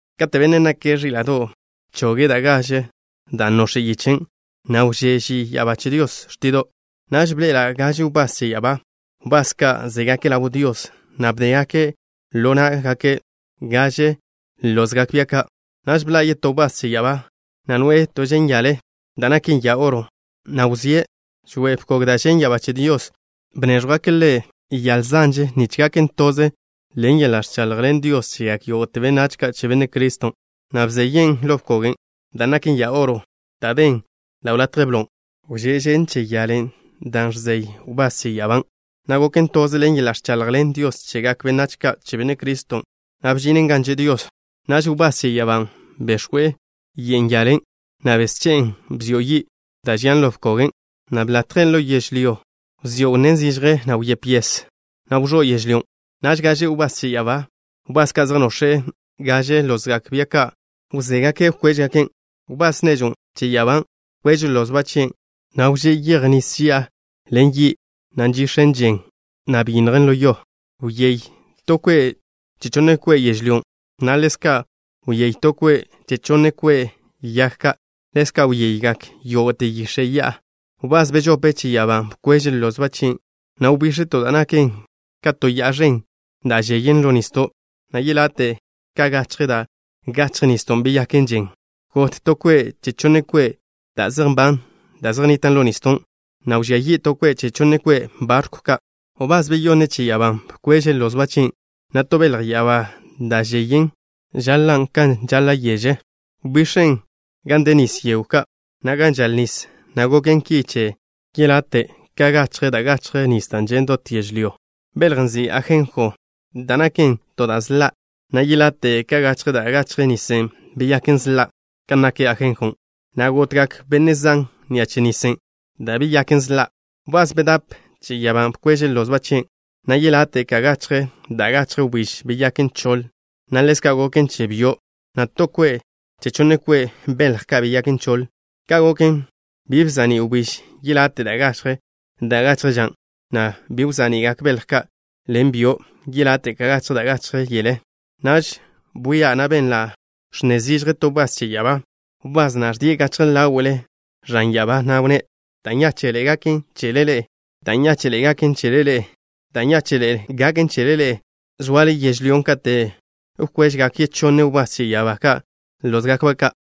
Kate' Bennen' nake' Ẕíla'do' bchoge' da' gaže da' nox̱en yichen', na' wžé' ži ya'abá che Dios xtido'. Naž bḻe'ela' gaže wbás che ya'abá, wbás ka' zégake' ḻaw Dios, na' bdégake' ḻo ná'gake' gaže lozgak bia ka'. Naž bḻa' yetó wbás che ya'abá, na' noe'e to že'n yale da' naken ya oro, na' wzíe' žoe'e bkog da' žen' ya'abá che Dios. Bnéẕjwgake' ḻe' yale ẕen nich gonen' toze ḻen yeḻa' ẕchaḻjḻen Dios chegak yógo'te benách ka' che Benne' Criston', na' bzeyen' ḻo bkogen' da' naken ya oro, da' den ḻaw latje blon'. Wžén žen che yalen' da' žen' ḻo na' wbás che ya'abán', na' goken toze ḻen yeḻa' ẕchaḻjḻen Dios chegak benách ka' che Benne' Criston', na' bžinen gan že' Dios. Naž wbás che ya'abán' bex̱we' ye'n yalen', na' besche'en bzio' yi' da' žian ḻo bkogen', na' bḻatjen' ḻo yežlyó. Wzió' wnnén zižje, na' wyép yes, na' wẕó' yežlyón'. Naž gaže wbás che ya'abá, wbás ka' zej nox̱e' gaže lozgak bia ka', wzóagake' wkwéžgaken'. Wbás nežw che ya'abá bkweže' lozba' chien', na' wžé' yej nis ži'a ḻen yi', na' žen che we', dan' byinnjen ḻo yo. Wyéy to kwe' che chonne kwe' yežlyón', na' ḻezka' wyéy to kwe' che chonne kwe' yag ka'. Ḻezka' wyeygak yógo'te yix̱e' ya'a. Wbás bežope che ya'abá bkweže' lozba' chien', na' wbix̱e to da' naken ka to ya'a ẕen da' žeyen ḻo nisdo', na' yelate' ka gachje da' gachje nisdon' beyaken žen. Got to kwe' che chonne kwe' da' zej nban da' zej nnitan' ḻo nisdon', na' wžía yi' to kwe' che chonne kwe' barkw ka'. Wbás beyonne che ya'abá bkweže' lozba' chien', na' to belj ya'abá da' žeyen ka yeže žaḻa' wbix̱en gan de nis yegw ka', na' gan žal nis, na' goken ki che yelate' ka gachje da' gachje nis da' žen' dot yežlyó. Beljen' nzin' Ajenjo, da' naken to da' sḻa', na' yelate' ka gachje da' gachje nisen' beyaken sḻa' kan nak ajenjon', na' gotgak benne' zan ni'a che nisen' da' beyaken sḻa'. Wbás bedáp che ya'abá bkweže' lozba' chien', na' yelate' ka gachje da' gachje wbíž beyaken choḻ, na' ḻezka' goken che byo', na' to kwe' che chonne kwe' belj ka' beyaken choḻ. Ka' goken, bi bza'ní' wbíž yelate' ka gachje da' gachje ža, na' bi wza'ni'gak belj ka' ḻen byo' yelate' ka gachje da' gachje yele. Naž bwia', na' benla' ẕnne zižje to wbás che ya'abá, wbás na' ẕdie' gachje ḻáwe'le ẕan ya'abá, na' wnné': “Da' nyáche'ḻe'e gaken chele ḻe'e. Da' nyáche'ḻe'e gaken chele ḻe'e. Da' nyáche'ḻe'e gaken chele ḻe'e, zoale yežlyó katen' wkwežgak yechonne wbás che ya'abá ka' lózgakba' ka'.”